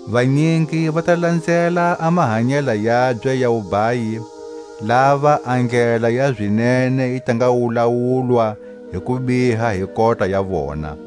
Vanyingi va ta lanzela a mahanyela yabye ya wubhayi, lava a ndlela ya zinene yi ta nga wulawulwa hi kubiha hi kota ya vona.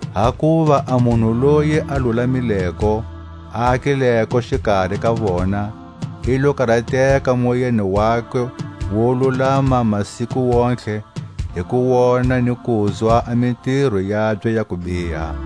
Hakuva a munhu loyi a lulamileko, a akileko xikari ka vona, i lo karateka moyeni wakwe wo lulama masiku wontihe, hi ku wona ni kuzwa a mitiro yabye ya kubiha.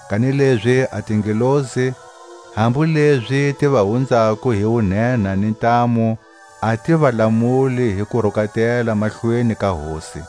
Kanilezi a tingelosi, hambu lezi ti va hunzako hi wunhenha ni ntamu, a ti va lamuli hi kurukatela mahlweni ka Hosi.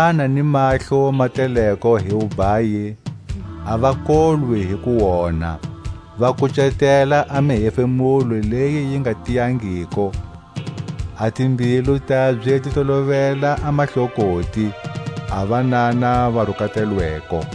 Va na ni mahlo ma teleko hi wubhayi, a va kolwi hi kuonha. Va kucetela a mihefemulo leyi yi nga tiyangiko. A timbilu tabye ti tolovela a mahlokoti; a vanana va rukatelweko.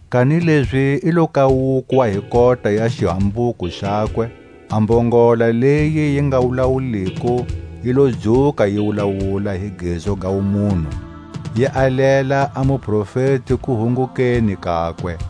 kanilezi i lo kawukwa hi kota ya xihambuko xakwe: a mbongola leyi yi nga wulawuliko yi lo dzuka yi wulawula hi gezu ga wumunhu, yi alela a muprofeti kuhungukeni kakwe.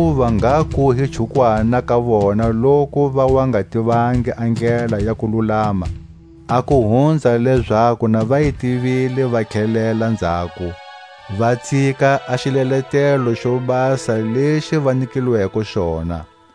Hakuva ngha ku hi chukwana ka vona loku va wa nga tivangi a ndlela ya kululama, a ku hunza lezaku na va yi tivile va tlhelela nzhako, va tsika a xileletelo xo basa lexi va nyikilweko xona.